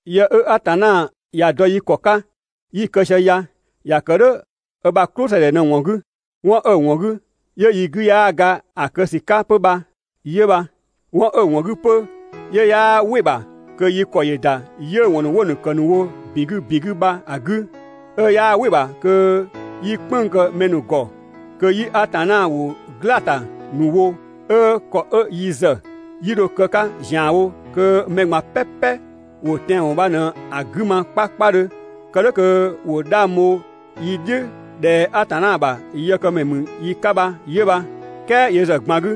Yë 'ö Atanna ‑ya dɔ yi ‑kɔ 'ka 'ö 'yi‑ kë sië ya ‑ya kë "dhʋ̈ 'ö ‑bha "klʋsëdhɛ ꞊në‑ ‑wɔn 'gü. 'Wɔn 'ö‑ ‑wɔn 'gü 'yö yi 'gü 'yaa ga ‑a kë ‑sü 'ka 'pö bha 'yö bha. 'Wɔn 'ö‑ ‑wɔn 'gü 'pö 'yö 'yaa "wɩ‑ ‑bha kö yi ‑kɔ ‑yö ‑da 'yiʋ̈‑ ‑wɔn ‑nu 'wo‑ ‑kë ‑nu wo ‑bin 'gü ‑bin 'gü bha‑ 'gü, 'ö 'yaa "wɩ‑ ‑bha kö 'yi "kpënng‑ kë mɛ ‑nu ‑gɔ, kö 'yi Atanna ‑wʋ "glaa‑ ‑ta ‑nu wo, 'ö ‑kɔ 'ö yi ‑zë 'yi dho‑ kë 'ka ‑zianwo kö mɛ ꞊gban "pɛpɛ ‑wo tɛanwɔn bha ꞊në‑ 'gü ma 'kpakpadhö, kë "dhʋ̈ kö ‑wo 'dhang bho yi "dhiʋ̈ ꞊dhɛ Atanna ‑bha yëkëmɛ ‑mü yi 'ka bha 'yö bha. "Kɛɛ yö ‑zë ꞊gban 'gü,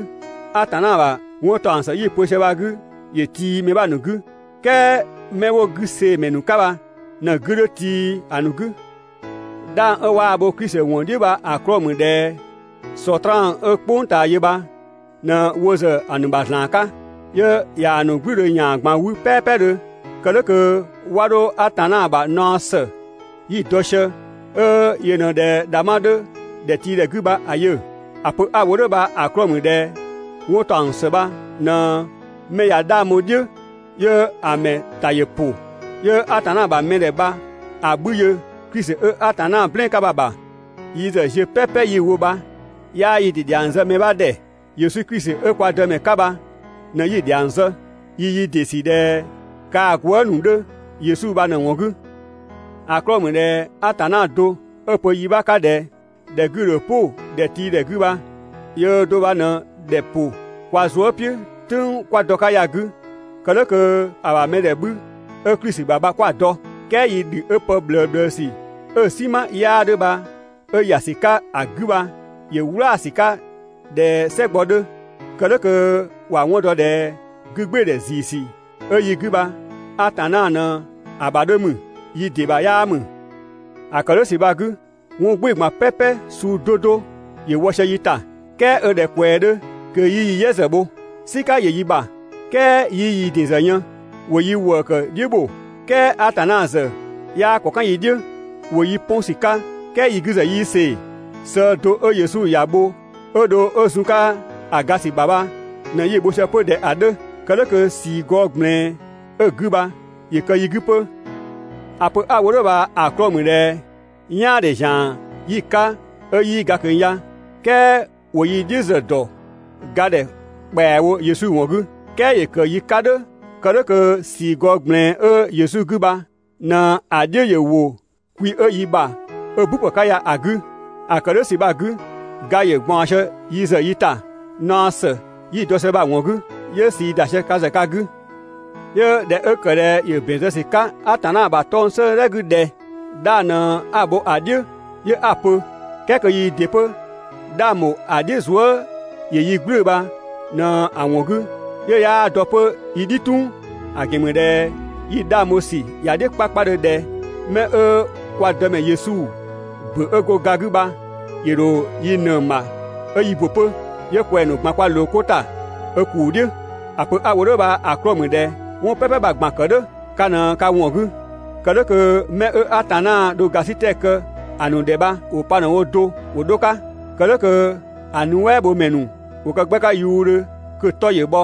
Atanna ‑bha 'wɔntaɔngsë 'yi‑ pö sië bha‑ 'gü ‑yö tii mɛ 'bha ‑nu 'gü. "Kɛɛ 'mɛ 'wo 'gü see‑ ‑mɛ ‑nu 'ka bha ꞊në‑ 'gü 'dhö tii ‑a ‑nu 'gü. 'Dhang 'ö 'waa‑ bho Klisi ‑wɔn "dhiʋ̈ bha‑ 'klɔɔ‑ ‑mü ꞊dhɛ Sɔtraan 'ö "kpʋng ꞊taa yö bha ꞊në wo ‑zë ‑a ‑nu ‑bha ‑zlan 'ka, 'yö ꞊yaa‑ ‑nu "gblüdhö ‑yan ꞊gban 'wü "pɛɛpɛdhö, kë "dhʋ̈ kö 'wa 'dho Atanna ‑bha naɔ ‑së 'yi‑ dɔ sië, 'ö yö ꞊në ꞊dhɛ ‑dhangbha 'dhö ‑dhɛtiidhɛ 'gü bha‑ yö. ‑A pö 'a‑ wo "dhʋ̈ bha‑ 'klɔɔ‑ ‑mü ꞊dhɛ 'wɔntaɔngsë bha ꞊në 'mɛ ꞊ya 'dhang bho‑ "dhiʋ̈ 'yö‑ ‑mɛ ‑ta ‑yö ‑pʋ, 'yö Atanna ‑bha mɛdhɛ bha‑ 'bhü yö Klisi 'ö Atanna "blɛɛn‑ 'ka bha‑ ‑bha. Yi ‑zë ziö "pɛpɛ 'yi‑ wo bha 'yaa yi ‑dɩ ‑dhiang zë mɛ 'bha ‑dhɛ, Yesu Klisi 'ö kwa Dëmɛ 'ka bha ꞊në 'yi‑ ‑dhiang zë. Yi yi ‑dɩ ‑sü ꞊dhɛ kaa‑ gwëëzë ‑nu 'dhö Yesu bha ꞊në‑ ‑wɔn 'gü. ‑A 'klɔɔ‑ ‑mü ꞊dhɛ Atanna do 'ö‑ pö yi 'bha 'ka ꞊dhɛ: «‑Dhɛ 'gü‑ ‑dho "pʋ ‑dhɛtiidhɛ 'gü bha» yöö do bha ꞊në ‑dhɛ ‑pʋ kwa zuë" "piʋ̈ "tʋ̈ng 'kwa dɔ‑ 'ka ya‑ 'gü kë "dhʋ̈ kö‑ ‑bha mɛdhɛ 'bhü 'ö Klisi ‑bha bha 'kwa‑ dɔ. "Kɛɛ yi ‑dhü 'ö pë ꞊bhlëbhlësü 'ö‑ "sima 'yaa 'dhö bha 'ö ‑ya ‑sü 'ka‑ 'gü bha ‑yö "wlaasü 'ka ꞊dhɛ "sɛgbɔ 'dhö, kë "dhʋ̈ kö ‑wa 'wɔn dɔ ꞊dhɛ 'gü gbɩɩdhɛ ‑ziisü 'ö yi 'gü bha Atanna ꞊në‑ ‑bha 'dhö ‑mü, yi ‑dɩ ‑bha 'yaa ‑mü. ‑A ‑kë "dhʋ̈ ‑sü bha‑ 'gü, 'wɔn "gbɩɩ‑ ꞊gban "pɛpɛ suu 'do 'do ‑yö wɔ sië yi ‑ta, "kɛɛ 'ö ꞊dhɛ ꞊kwɛɛ 'dhö kö 'yii yi "yɛ ‑zë bho. "Sika ‑yö yi ‑bha "kɛɛ 'yii yi ‑din ‑zë yën. ‑Wo yi ‑wëëkë "dhiʋ̈ ‑bho, "kɛɛ Atanna ‑zë 'yaa ‑kɔ "kan yi "dhiʋ̈. ‑Wo yi 'pɔn ‑sü 'ka "kɛɛ yi 'gü ‑zë 'yii see‑. Sëë do 'ö Yesu ‑ya bho 'ö dho 'ö zun‑ 'ka‑ ga ‑sü ‑bha bha ꞊në 'yi‑ bho sië 'pö ꞊dhɛ‑ 'dhö, kë "dhʋ̈ kö ꞊sii gɔɔ ꞊gblɛɛn 'ö‑ 'gü bha ‑yö ‑kë yi 'gü 'pö. ‑A pö 'a‑ wo "dhʋ̈ bha‑ 'klɔɔ‑ ‑mü ꞊dhɛ "yaandhe ‑zian 'yi‑ 'ka 'ö 'yii ga ꞊kö ya, "kɛɛ ‑wo yi "dhiʋ̈ ‑zë ‑dɔ ga ‑dhɛ ‑kpɛawo Yesu ‑wɔn 'gü. "Kɛɛ ‑yö ‑kë yi 'ka "dhʋ̈ kë "dhʋ̈ kö ꞊sii gɔɔ ꞊gblɛɛn 'ö Yesu 'gü bha ꞊në‑ "dhiʋ̈ ‑yö ‑wo kwi 'ö yi ‑bha 'ö "bu ‑pë 'ka ya‑ 'gü. ‑A ‑kë "dhʋ̈ ‑sü bha‑ 'gü, ga ‑yö ꞊gbaɔn sië yi ‑zë yi ‑ta (naɔ ‑së 'yi‑ dɔ sië bha‑ ‑wɔn 'gü), 'yö ꞊sii ‑da sië ka ‑zë ka 'gü. 'Yö ꞊dhɛ 'ö ‑kë ꞊dhɛ ‑yö ‑bɛn zë ‑sü 'ka Atanna ‑bha 'tɔng‑ 'sëëdhɛ 'gü ꞊dhɛ: «'Dhang ꞊në 'a‑ ‑bho ‑a "dhiʋ̈ 'yö 'a‑ pö», "kɛɛ kö yii ‑dɩ 'pö 'dhang ‑bho ‑a "dhiʋ̈ zuë" ‑yö yi "gblʋ̈ʋ̈‑ bha ꞊në‑ ‑wɔn 'gü 'yö 'yaa dɔ 'pö yi "dhi "tung. ‑A ‑gɛn ‑mü ꞊dhɛ yi 'dhang bho ‑sü ‑ya "dhiʋ̈ 'kpakpadhö ꞊dhɛ 'mɛ 'ö kwa Dëmɛ Yesu ‑bö 'ö go ga 'gü bha ‑yö ‑dho yi ꞊nëng ‑bha 'ö yi ‑bö 'pö. 'Yö kwɛng‑ ‑nu ꞊gban kwa ꞊loo 'ko ‑ta 'ö ‑kuu "dhiʋ̈. ‑A pö 'a‑ wo "dhʋ̈ bha‑ 'klɔɔ‑ ‑mü ꞊dhɛ 'wɔn "pɛpɛ bha‑ ꞊gban‑ ‑kë "dhʋ̈ ka ꞊në ka ‑wɔn 'gü, kë "dhʋ̈ kö 'mɛ 'ö Atanna dho ‑gasitɛ kë‑ ‑nu ‑dhɛ bha ‑wo pa ꞊në‑ wo do ‑wo 'dho‑ 'ka, kë "dhʋ̈ kö‑ nuɛ" bho ‑mɛ ‑nu ‑wo kë 'gbɛ 'ka yuudhö kö‑ 'tɔ ‑yö bhɔ.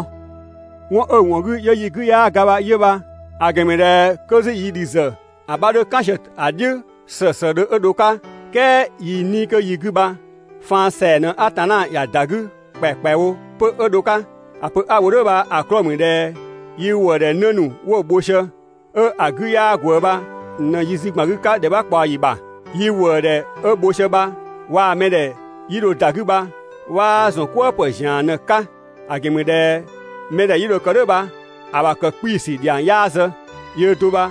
'Wɔn 'ö‑ ‑wɔn 'gü 'yö yi 'gü 'yaa ga bha 'yö bha. ‑A ‑gɛn ‑mü ꞊dhɛ 'kö 'zü yi ‑dhü ‑zë 'bha 'dhö "kan sië‑ "dhiʋ̈ ‑slëëslëëdhö 'ö dho‑ 'ka, "kɛɛ yi 'nii‑ kö yi 'gü bha faan ‑sɛa ꞊në Atanna ‑ya ‑da 'gü ‑kpɛakpɛawo 'pö 'ö dho‑ 'ka. ‑A pö 'a‑ wo "dhʋ̈ bha‑ 'klɔɔ‑ ‑mü ꞊dhɛ yi ‑wëëdhɛ 'në ‑nu 'wo bho sië 'ö‑ 'gü 'yaa ꞊gwëë bha ꞊në yi zü ‑gban 'gü 'ka ‑dhɛ 'bha ꞊kpaɔyi ‑bha, yi ‑wëëdhɛ 'ö bho sië bha waa‑ mɛdhɛ 'yi dho ‑da 'gü bha 'waa ‑zɔn "kwëë ‑pë ‑zian ꞊në‑ 'ka. ‑A ‑gɛn ‑mü ꞊dhɛ mɛdhɛ 'yi dho‑ kë "dhʋ̈ bha‑ ‑bha ‑kë 'kpii‑ ‑sü ‑dhiang 'yaa zë, yöö do bha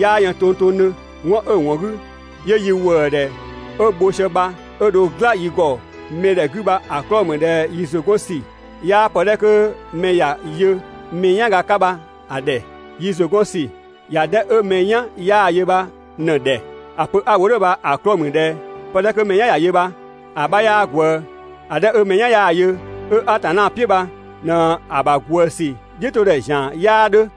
'yaa yën tongtongdhö. 'Wɔn 'ö‑ ‑wɔn 'gü 'yö yi ‑wëëdhɛ 'ö bho sië bha 'ö dho "gla yi ‑gɔ mɛdhɛ 'gü bha‑ 'klɔɔ‑ ‑mü ꞊dhɛ yi ‑zʋ 'gɔn ‑sü 'yaa pë 'dhɛ 'kö mɛ ‑ya yö mɛ "yanga 'ka bha‑ ‑dhɛ. Yi ‑zʋ 'gɔn ‑sü ‑ya 'dhɛ 'ö mɛ "yan 'yaa‑ yö bha ꞊në‑ ‑dhɛ. ‑A pö 'a‑ wo "dhʋ̈ bha‑ 'klɔɔ‑ ‑mü ꞊dhɛ pë 'dhɛ 'kö mɛ "yan ‑ya yö bha‑ 'bha 'yaa ꞊gwëë ‑A 'dhɛ 'ö mɛ "yan 'yaa‑ yö 'ö Atanna "piʋ̈ bha ꞊në‑ ‑bha ꞊gwëë ‑sü "dhiʋ̈todhɛ ‑zian 'yaa 'dhö.